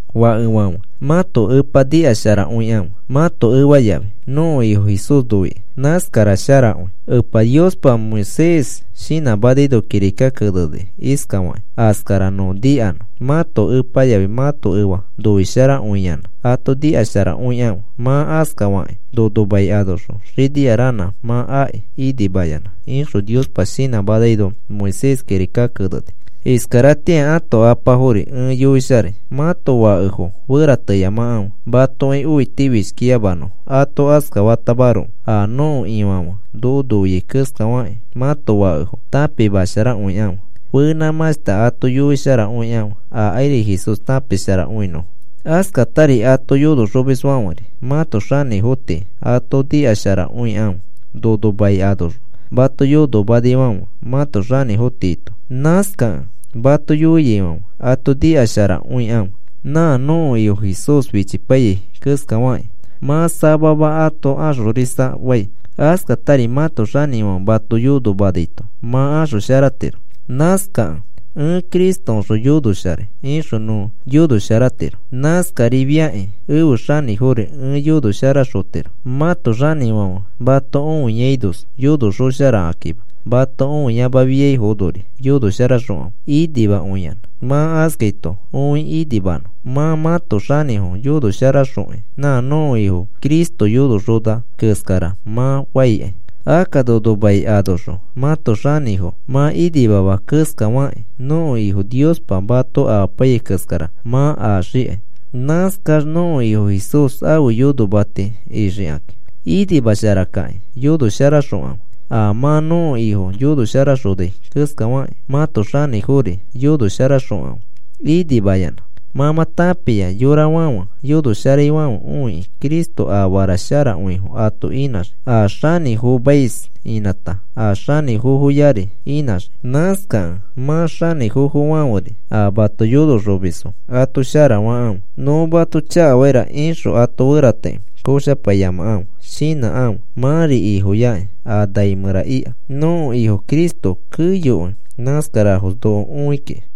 Fakefãfe, mãto epa nikasharakõikãfe mãto efa yafi, nõko Ifo Jesús noikĩ. Nãskara sharakõi. Epa Niospa Moisés shinãmanaino kirika keneni iskafakĩ askara nõ nikanõ: “Mãto epa yafi mãto efa noisharakõiyanã ato nikasharakõikãfe. Mã askafakĩ nono mai anoxõ xinia ranã mã aki inimayanã,” ixõ Niospa shinãmaino Moisés kirika keneni. Iskaratĩa ãto apafori ẽ yoisharai. Mãto fakefo ferateyamakãfe matoki õitifishkiyamanõfo. Ato askafatamaroko a nõko Ifãfe noko noiai keskafakĩ, mãto fakefo tãpimasharakõikãfe. Fenãmãshta ato yoisharakõikãfe akairi Jesús tãpisharakõinõfo. Askatari ato yonoxomisfãferi mãto xanĩfo tii ato nikasharakõikãfe, nono mai anoxõ mato yonomanaifãfe mãto xanĩfo tiito. Nãskakẽ mato yoiaifãfe ato nikasharakõikãfe, nã nõko Ifo Jesús fichipaiyai keskafakĩ mã samama ato axorisa fai. Askatari mãto xanĩfãfe mato yonomanaito mã axosharatiro. Nãskakẽ, “Ẽ Cristoõxõ yonosharai,” ixõ nõ yonosharatiro. Nãskarifakĩ ẽfe xanĩfori ẽ yonosharaxotiro. Mãto xanĩfãfe mato õiainos yonoxosharakakima, mato õiayamafiainori yonosharaxokãfe inimakõiyanã. Mã askaito õi inimanõ. Mã mãto xanĩfo yonosharaxokĩ, nã nõko Ifo Cristo yonoxona keskara mã faikai. Akka nono mai anoxõ mãto xanĩfo mã inimama keskafakĩ, nõko Ifo Niospa mato amapaiyai keskara mã axikai. Nãskax nõko Ifo Jesús ãfe yonomati ixikakĩ. Inimasharakĩ yonosharaxokãfe. A mã nõko Ifo yonosharaxonai keskafakĩ mãto xanĩfori yonosharaxõkãfe inimayanã. Mã mã tãpia yorafãfe yonosharaifãfe õikĩ, Cristo afara sharakõifo ato inãxii, a xanĩfomais inãta a xanĩfoyari inãxii. Nãskakẽ mã xanĩfofofãferi, a mato yonoxomisfo ato shara fakãfe. Nõ mato chakafaira ixõ ato ferateki koshapaiyamakãfe. Shinãkãfe, mãri Ifoyakĩ a nai mẽra ika. Nõko Ifo Cristo keyokõi nãskarafos noko õi kiki.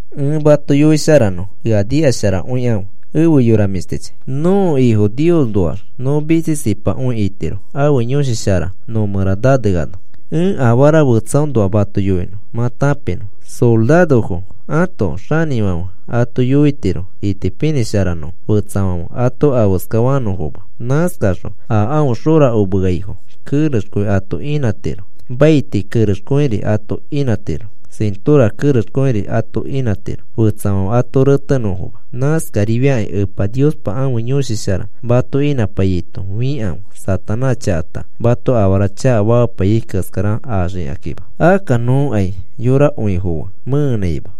Ẽ mato yoisharanõ, ea nikasharakõikãfe, efe yora mĩshtichi. Nõko Ifo Niosnoax nõ mitsisipakõi itiro ãfe Yõshi Shara no mẽra naneano. Ẽ afara fetsaõnoa mato yoinõ mã tãpinõ. Sorarofo ãto xanĩfãfe ato yoitiro itipinĩsharanõfo fetsafãfe ato afeska fanõfoma. Nãskaxõ a aõ xorakomeaifo kerexkõi ato inãtiro, maiti kerexkõiri ato inãtiro, sĩtora kerexkõiri ato inãtiro fetsafãfe ato retenõfoma. Nãskarifiakĩ Epa Niospa ãfe Yõshi Shara mato inãpaiyaito fikãfe, Satanás chakata mato afara chakafamapaiyai keskara axikakĩma. Akka nõkai yorakõifo fe mẽenãima.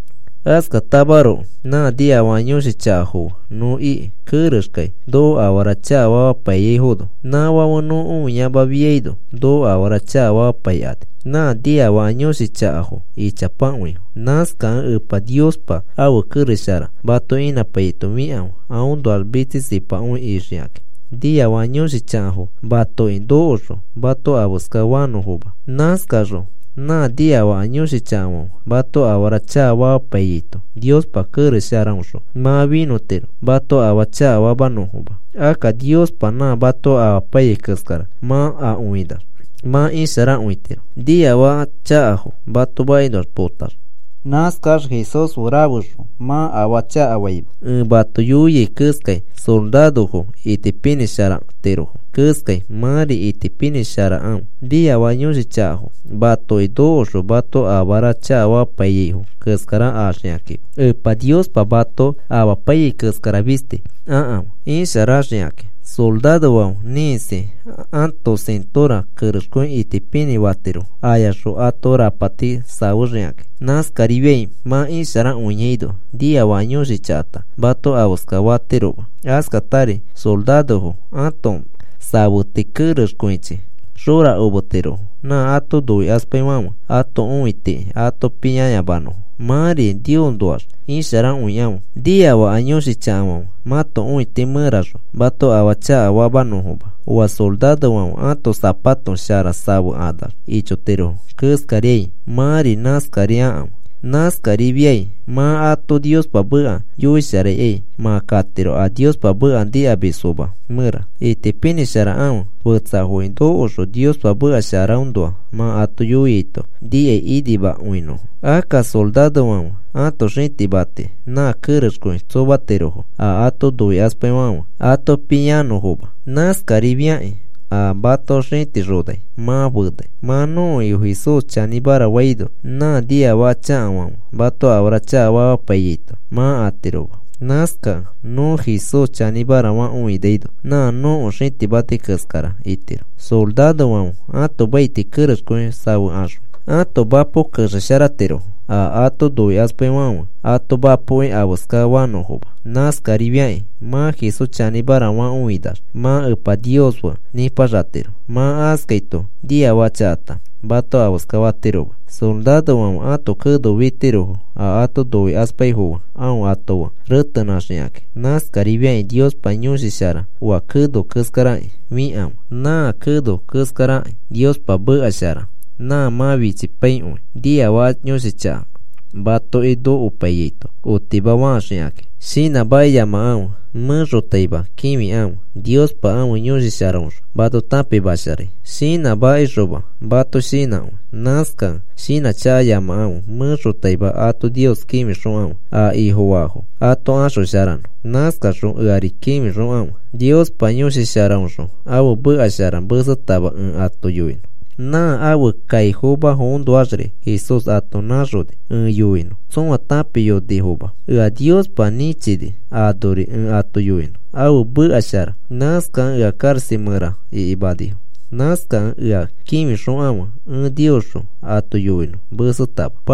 Askatamaroko nã niafaka yõshi chakafo fe nõ iki, kerexkai noko afara chakafamapaiyaifono. Nãfãfe nõ õiamafiaino noko afara chakafamapaikani. Nã niafaka yõshi chakafo ichapakõifo. Nãskakẽ Epa Niospa ãfe kerex shara mato inãpaiyaito fikãfe aõnoax mitsisipakõi ixikakĩ, niafaka yõshi chakafo matoki nokoxõ, mato afeska fanõfoma. Nãskaxõ nã niafaka yõshi chakafãfe mato afara chakafamapaiyaito Niospa kerex sharaõxõ mã finõtiro mato afaa chakafamanõfoma. Akka Niospa nã mato amapaiyai keskara mã akõinax mã isharakõitiro, niafaka chakafo mato makinoa potax. Nãskax Jesús fe rafexõ mã afaa chakafaima. Ẽ mato yoiai keskai sorarofo itipinĩ sharatirofo keskai. Mãri itipinĩ sharakãfe niafaka yõshi chakafo matoki nokoxõ mato afara chakafamapaiyaifo keskara axikakĩma. Epa Niospa mato amapaiyai keskara fisti akãfe isharaxikakĩ. Sorarofãfe ĩkisi ãto sĩtora kerexkõi itipinĩ fatirofo ayaxõ ãto rapati safexikakĩ. Nãskarifiai mã isharakõiaino niafaka yõshi chakata mato afeska fatiroma. Askatari sorarofo ãto safeti kerexkõichinĩ xorakometirofo, nã ato noikaspaifãfe ãto õitiki ato pĩanõfoma. Mãri Niosnoax isharakõikãfe, nikafaka yõshi chakafãfe mãto õiti mẽraxõ mato afaa chakafamanõfoma. Oa sorarofãfe ãto sapato shara safekanax ichotirofo keskariai, mãri nãskari akãfe. Nãskarifiai mã ato Niospa meka yoisharaikai mã katiro a Niospa meka nikamisfoma mẽra. Itipinĩ sharakãfe fetsafoki nokoxõ Niospa meka sharaõnoa mã ato yoiaito nikai inimakõinõfo. Akka sorarofãfe ãto xĩtimati nã kerexkõi tsomatirofo a ato noikaspaifãfe ato pĩanõfoma. Nãskarifiakĩ a mato xĩtixonai mã fenai. Mã nõko Ifo Jesús chanĩmara faino nã niafaka chakafãfe mato afara chakafamapaiyaito mã atiroma. Nãskakẽ nõ Jesús chanĩmara fakõinaino nã nõko xĩtimati keskara itiro. Sorarofãfe ãto maiti kerexkõi safekaxõ ãto mapo kexesharatirofo, a ato noikaspaifãfe ato mapoki afeskafanõfoma. Nãskarifiakĩ mã Jesús chanĩmara fakõinax mã Epa Nios fe nipaxatiro. Mã askaito niafaka chakata mato afeska fatiroma. Sorarofãfe ãto keno fitirofo a ato noikaspaifo fe aõ ato fe retenãxikaki. Nãskarifiakĩ Niospa Yõshi Shara oa keno keskaraki fikãfe. Nã keno keskaraki Niospa meka shara nã mã fichipaikõi niafaka yõshi chaka matoki nokopaiyaito otimafaxikakĩ. Shinãmakiyamakãfe. Mẽxotaima kĩfikãfe Niospa ãfe Yõshi Sharaõxõ mato tãpimasharai. Shinãmakixoma mato shinãkõi. Nãskakẽ shinãchakayamakãfe. Mẽxotaima ato Nios kĩfixokãfe a Ifofaafo ato axosharanõ. Nãskaxõ eari kĩfixokãfe Niospa Yõshi Sharaõxõ ãfe meka shara mesetama ẽ ato yoinõ. Nã ãfe kaifomafoõnoaxri Jesús ato nãxoni ẽ yoinõ tsõa tãpiyonifoma. Ea Niospa nĩchini anori ẽ ato yoinõ ãfe meka shara. Nãskakẽ ea karaxa mẽra ikimanifo. Nãskakẽ ea kĩfixokãfe ẽ Niosxõ ato yoinõ mesetama.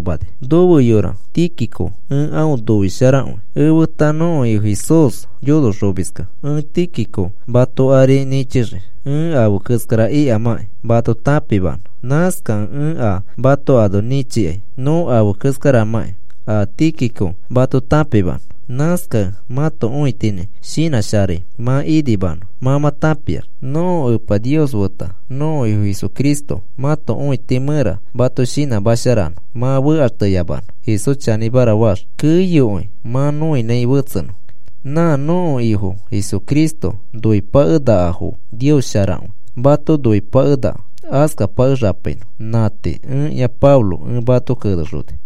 Nofe yora Tíquico ẽ aõ noisharakõi. Efeta nõko Ifo Jesús yonoxomiskẽ. Ẽ Tíquico mato ari nĩchixii, ẽ afe keskara ikamãkĩ mato tãpimanõ. Nãskakẽ ẽ a mato ano nĩchikai nõ afe keskaramãki a Tíquico mato tãpimanõ. Nãskakẽ mãto õitinĩ shinãsharai mã inimanõ mã mã tãpiax. Nõko Epa Nios feta nõko Ifo Jesucristo mãto õiti mẽra mato shinãsharamanõ mã fekaxteyamanõ. Jesús chanĩmara faax, keyokõi mã nõinãi fetsenõ. Nã nõko Ifo Jesucristo noipakenakafo Nios sharakõi mato noikõipakenaka. Askapakexapainõ. Nã tii. Ẽkĩa Pablo ẽ mato kenexoni.